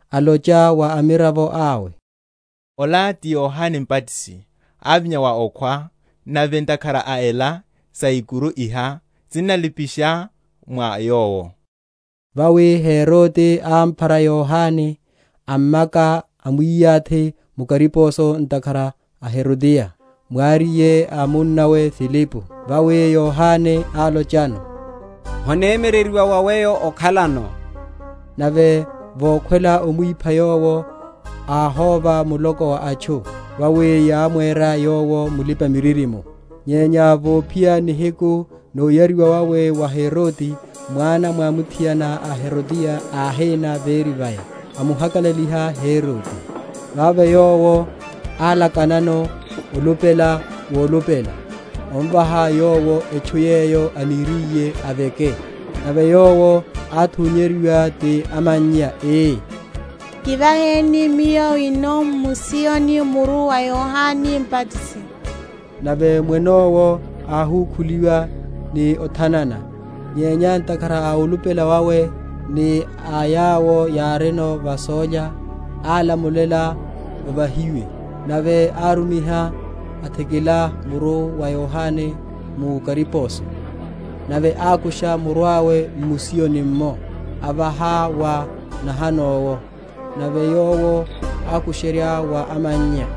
alocha wa amiravo awe, Ola ti Yohane Mbatisi; ávinya wa okhwa; nave ntakhara a ela saikuru iha sinnalipasha mwa yowo. Vawi Herode ámphara Yohane, ammaka, amwiyathi mu kariposo ntakhara a Herodiya, mwariye a munnawe Filipo. Vawi Yohane álochano, Honemyereryiwa wa weyo okhalano. Nave vokhwela omwipha yowo, áhóva muloko wa atchu, vawi yámwera yowo mulipa‐miririmo. Nyenya vophiya nihiku noyariwa wawe wa Herode, mwana mwamuthiana a Herodiya áhína véri vaya, amuhakalaliha Herode. Vavo yowo álakanano olupela wolupela, omvaha yowo etchu yeyo aniriye aveke. Nave yowo, átunyeryiwa ti amannya, ii, Kivaheni miyo wino m’musiyoni muru wa Yohane Mbatisi. Nave mwene owo áhukhuliwa ni othanana; nyenya ntakhara a olupela wawe, ni a yawo yárino va sólya, álamulela ovahiwe; nave árumiha, athikila muru wa Yohane mu kariposo. Nave ákusha muru awe m’musiyoni’mmo, avaha wa nahano’wo: nave yowo ákusherya wa amannya.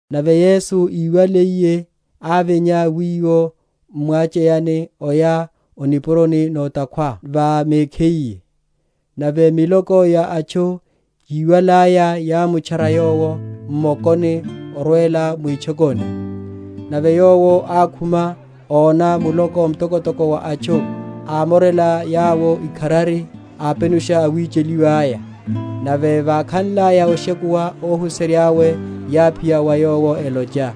Nave Yesu iwaliye, ávinya wiwo m’mwacheyani, oya o nipuroni na’takhwa va mekhiye: nave miloko ya atchu, yiwalaya, yámutchara Yowo m’mokoni orwela mwitchokoni. Nave Yowo ákhuma, óna muloko mtokotoko wa atchu, ámorela yawo ikharari, apenusha awicheliwa’ya. Nave vákhanlaya oshekuwa, óhuserya’we yáphiya wa Yowo, elocha,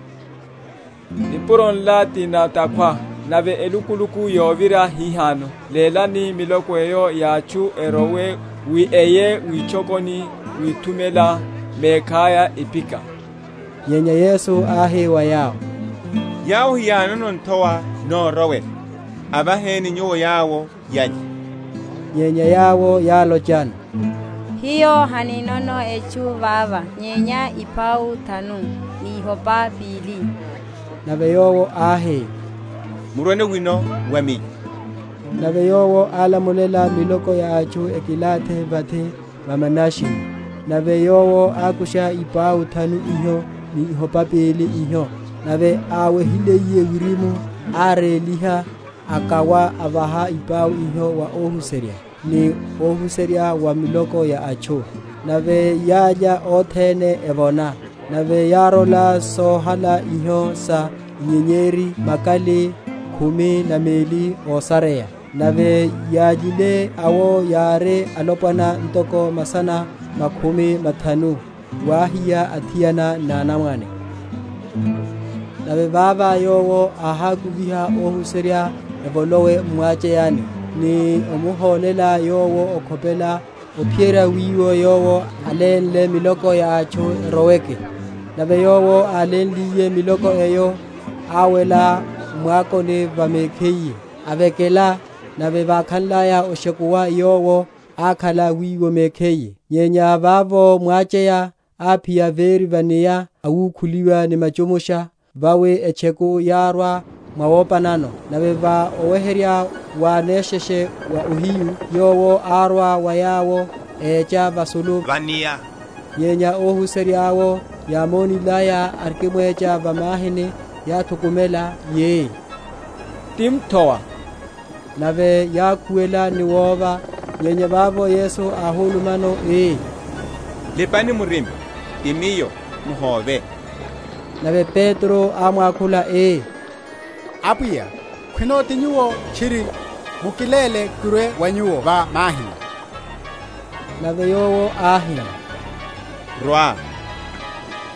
Nipuro nla ti na’takhwa, nave elukuluku yovira hihano; lélani miloko eyo ya atchu erowe, wi eye witchokoni withumela mekhaya iphika. Nyenya Yesu áhi wa yawo, Yawo hiyánono nthowa norowela, avaheni nyuwo yawo yalye. Nyenya yawo yálochano, Hiyo haninono etchu vava nyenya ipau thanu, ni ihopa pili. Nave Yowo áhi, Murweno wino wa Miyo. Nave Yowo álamulela miloko ya atchu ekilathi vathi va manashini; nave Yowo ákusha ipau thanu iho ni ihopa pili iho, nave áwehiliye wirimu, áréliha, akawa, avaha ipau iho wa ohuserya, ni ohuserya wa miloko ya atchu. Nave yálya othene evona: nave yárola sohala iho sa inyenyeri, makali khumi na meli ósareya. Nave yályile awo yári alopwana ntoko masana makhumi mathanu, wáhiya athiana ni anamwane. Wecha wa Yesu va’nia. Nave vava Yowo áhakuviha óhuserya evolowe m’mwacheyani, ni omuhólela Yowo okhopela, ophiyerya wiwo Yowo alénle miloko ya atchu eroweke. Nave Yowo álénliye miloko eyo, áwela m’mwakoni va mekhiye, ovekela: nave vákhanlaya oshekuwa, Yowo ákhala wiwo mekhiye. Nyenya vavo mwacheya áphiya véri va’nia, awukhuliwa ni machumusha; vawi etcheku yárwa mwawopanano. Nave va oweherya wa nesheshe wa ohiyu, Yowo árwa wa yawo, écha vasulu va’nia. Nyenya óhuserya’wo yámonilaya, arikimwecha va mahini, yáthukumela, yi, Ti mthowa! Nave yákhuwela ni wova. Nyenya vavo Yesu áhulumano ii, Lipani murima; ti Miyo; muhóve. Nave Petro ámwakhula ii, Apwiya, khwino ti Nyuwo tchiri, mukiléle kirwe wa Nyuwo va mahini, Nave Yowo áhi, Rwa.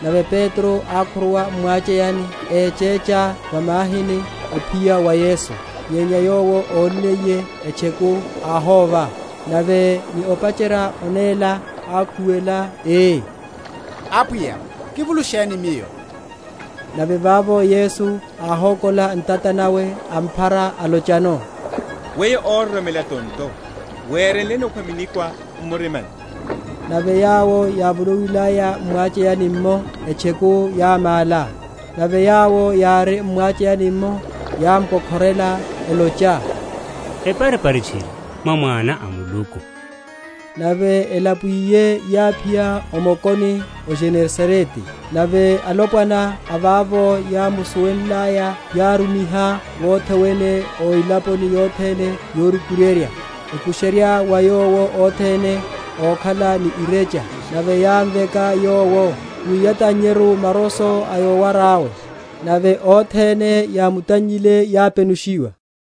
Nave Petro ákhuruwa m’mwacheyani, échecha va mahini, ophiya wa Yesu. Nyenya yowo ónniye etcheku, áhóva; nave ni opacherya onéla, ákhuwela, ii, Apwiya, kivulusheni miyo! Nave vavo Yesu áhokola ntata nawe, amphara, alochano, Weyo óroromela tonto, werenleni okhwa minikwa m’murimani? Nave yawo yávolowilaya m’mwacheyani’mmo, etcheku yámála. Nave yawo yári m’mwacheyani’mmo yámko?-?khorela, elocha, Eparipari tchiri, mwá Mwana a Muluku. Nave elapuwiye yáphiya o mokoni, o Genesarete. Nave alopwana a vavo yámusuwenlaya, yárumiha wothe wene o elaponi yothene yorukuryerya, ekusherya wa Yowo othene ókhala ni irecha; nave yámveka Yowo, wi yatannyeru maroso a yowara yawe: nave othene yámutannyile yápenushiwa.